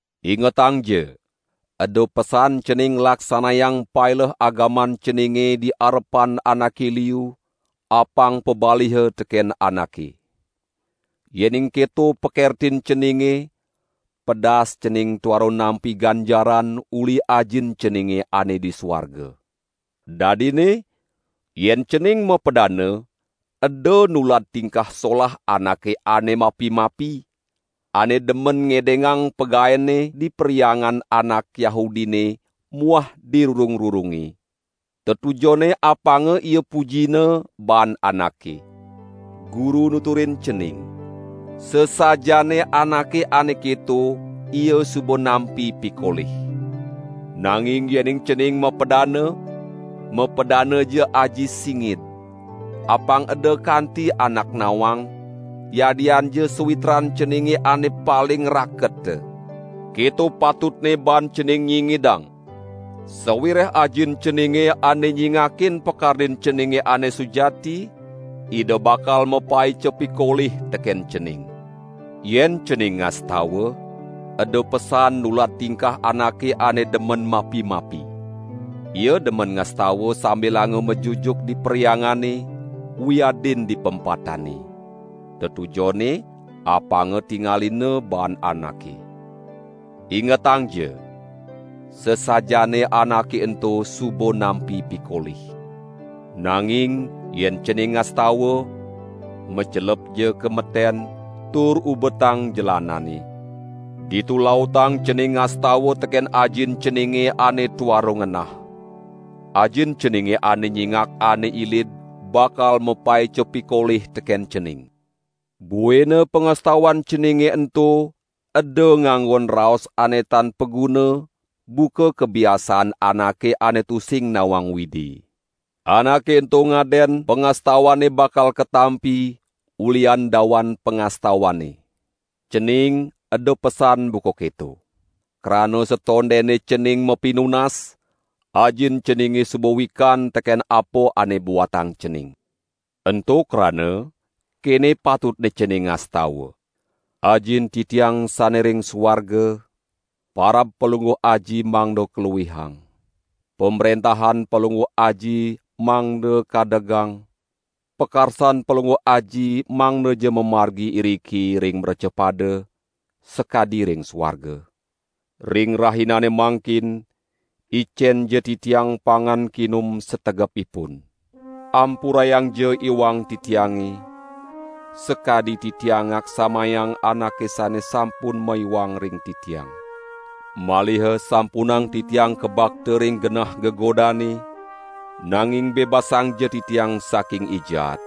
"Ingetangja! Eda pesan cening nglaksanayang paileh agaman ceninge di arepan anake liu, apang pabaliha teken anake. Yening keto pakertin ceninge, pedas cening tuara nampi ganjaran uli Ajin ceninge ane di suarga. Dadinne, yen cening mapadana, eda nulad tingkah solah anake ane mapi-mapi, ane demen ngedengang pagaenne di perhyangan anak Yahudine muah di rurung-rurunge; tetujonne apanga ia pujina baan anake. Guru nuturin cening: Sasajaane anake ane keto, ia suba nampi pikolih. Nanging yening cening mapadana, mapadanaja aji singid. Apang eda kanti ada anak nawang, yadianja sawitran ceninge ane paling raketa. Keto patutne baan cening nyingidang. Sawireh Ajin ceninge ane nyingakin pakardin ceninge ane sujati, Ida bakal mapaica pikolih teken cening." "Yen cening ngastawa, eda pesan nulad tingkah anake ane demen mapi-mapi. Ia demen ngastawa sambilanga majujuk di perhyangane, wiadin di pempatane. Tetujonne apanga tingalina baan anake. Ingetangja: Sasajaane anake ento suba nampi pikolih. Nanging yen cening ngastawa, macelepja ka meten, tur ubetang jelanane! Ditu lautang cening ngastawa teken Ajin ceninge ane tuara ngenah. Ajin ceninge ane nyingak ane ilid bakal mapaica pikolih teken cening. Buina pangastawan ceninge ento eda nganggon raos ane tan paguna buka kabiasaan anake ane tusing nawang Widi. Anake ento ngaden pangastawanne bakal katampi ulihan dawan pangastawanne. Cening eda pesan buka keto! Krana satondene cening mapinunas, Ajin ceninge suba wikan teken apa ane buatang cening. Ento krana, kene patutne cening ngastawa: Ajin titiang sane ring suarga, parab Palungguh Aji mangda kaluihang. Pamrentahan Palungguh Aji mangda kadegang, pakarsan Palungguh Aji mangdaja mamargi iriki ring mrecapada, sakadi ring suarga. Ring rahinane mangkin, icenja titiang pangan kinum sategepipun. Ampurayangja iwang titiange, sakadi titiang ngaksamayang anake sane sampun maiwang ring titiang. Maliha sampunang titiang kabakta ring genah gegodane, nanging bebasangja titiang saking I Jaat.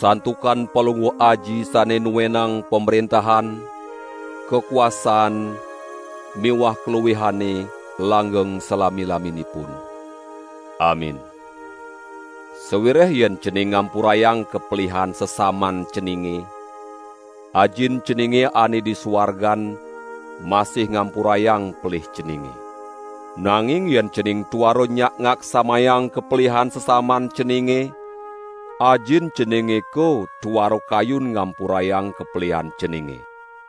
Santukan Palungguh Aji sane nuwenang pamrentahan, kakuasaan miwah kaluihane langgeng salami-laminipun. Amin.] Sawireh yen cening ngampurayang kapelihan sesaman ceninge, Ajin ceninge ane di suargan masih ngampurayang pelih ceninge. Nanging yen cening tuara nyak ngaksamayang kapelihan sesaman ceninge, Ajin ceninge ko tuara kayun ngampurayang kapelihan ceninge."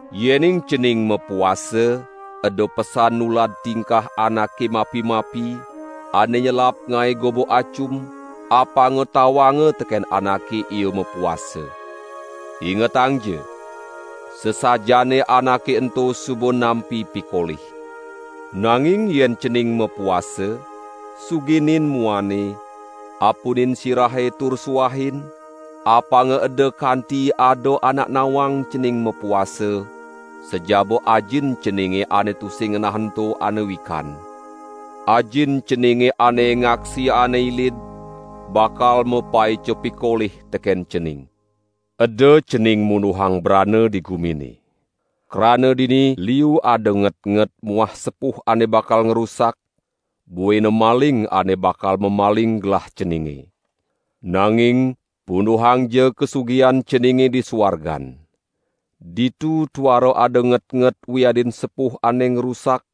"Yening cening mapuasa, eda pesan nulad tingkah anake mapi-mapi, ane nyelap ngae goba acum, apanga tawanga teken anake ia mapuasa. Ingetangja: Sasajaane anake ento suba nampi pikolih. Nanging yen cening mapuasa, suginin muane, apunin sirahe tur suahin, apanga eda kanti ada anak nawang cening mapuasa, sajaba Ajin ceninge ane tusing ngenah ento ane wikan. Ajin ceninge ane ngaksi ane ilid, bakal mapaica pikolih teken cening." "Eda cening munduhang brana di gumine. Krana dini liu ada ngetnget muah sepuh ane bakal ngrusak, buina maling ane bakal mamaling gelah ceninge. Nanging punduhangja kasugihan ceninge di suargan. Ditu tuara ada ngetnget wiadin sepuh ane ngrusak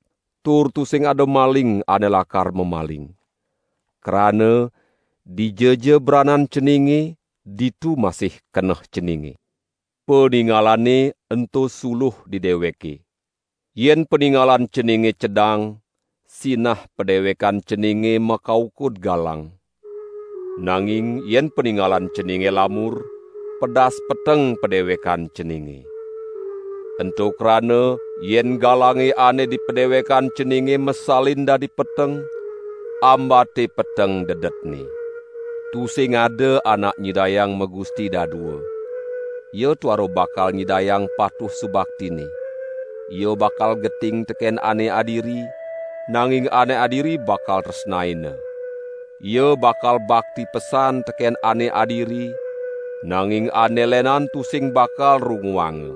tur tusing ada maling ane lakar mamaling. Krana, dijaja branan ceninge, ditu masih keneh ceninge." "Paningalane ento suluh di deweke. Yen paningalan ceninge cedang, sinah padewekan ceninge makaukud galang. Nanging yen paningalan ceninge lamur, pedas peteng padewekan ceninge. Ento krana yen galange ane di padewekan ceninge masalin dadi peteng, ambate peteng dedetne." "Tusing ada anak nyidayang magusti dadua. Ia tuara bakal nyidayang patuh subaktinne. Ia bakal geting teken ane adiri, nanging ane adiri bakal tresnaina. Ia bakal bakti pesan teken ane adiri, nanging ane lenan tusing bakal runguanga.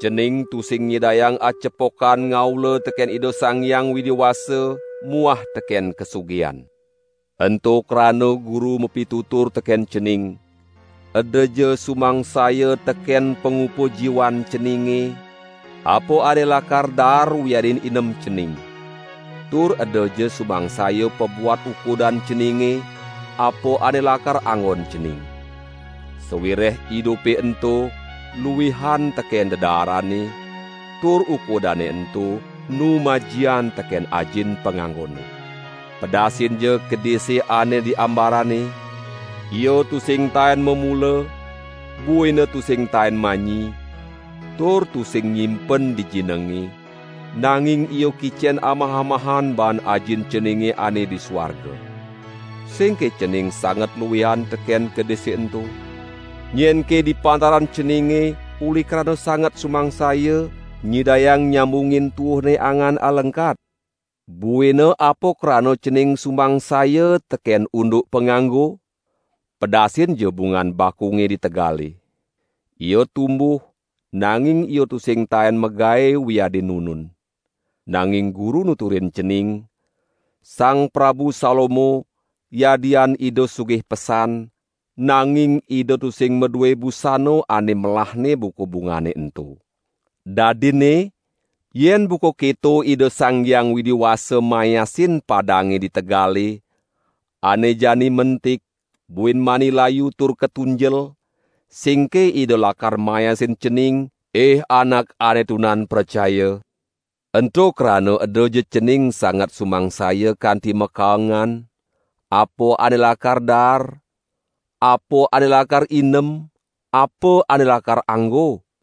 Cening tusing nyidayang acepokan ngaula teken Ida Sang Hyang Widi Wasa muah teken kasugihan. Ento krana Guru mapitutur teken cening: Edaja sumangsaya teken pangupa jiwan ceninge, apa ane lakar daar wiadin inem cening. Tur edaja sumangsaya pabuat ukudan ceninge, apa ane lakar anggon cening. Sawireh idupe ento luihan teken dedaarane, tur ukudane ento enu majian teken ajin panganggone. Pedasinja kedise ane di ambarane, ia tusing taen mamula, buina tusing taen manyi, tur tusing nyimpen di jinenge, nanging ia kicen amah-amahan baan Ajin ceninge ane di suarga. Singke cening sanget luihan teken kedise ento? Nyenke di pantaran ceninge, uli krana sanget sumangsaya, nyidayang nyambungin tuuhne angan alengkat? Buina apa krana cening sumangsaya teken unduk panganggo? Pedasinja bungan bakunge di tegale. Ia tumbuh nanging ia tusing taen magae wiadin nunun. Nanging Guru nuturin cening: Sang Prabu Salomo, yadian Ida sugih pesan, nanging ida tusing madue busana ane melahne buka bungane ento. Dadinne yen buka keto Ida Sang Hyang Widi Wasa mayasin padange di tegale, ane jani mentik, buin mani layu tur katunjel, singke Ida lakar mayasin cening, ih anak ane tunan pracaya? Ento krana edaja cening sanget sumangsaya kanti makaengan: Apa ane lakar daar? Apa ane lakar inem? Apa ane lakar anggo?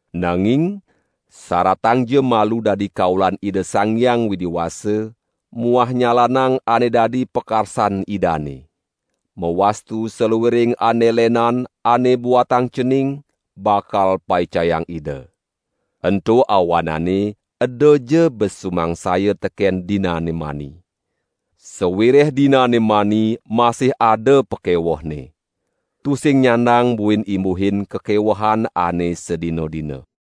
Nanging saratangja malu dadi kaulan Ida Sang Hyang Widi Wasa muah nyalanang ane dadi pakarsan Idane. Mawastu saluiring ane lenan ane buatang cening bakal paicayang Ida. Ento awanane edaja bes sumangsaya teken dinane mani. Sawireh dinane mani masih ada pakewehne. Tusing nyandang buin imbuhin kakewehan ane sadina-dina."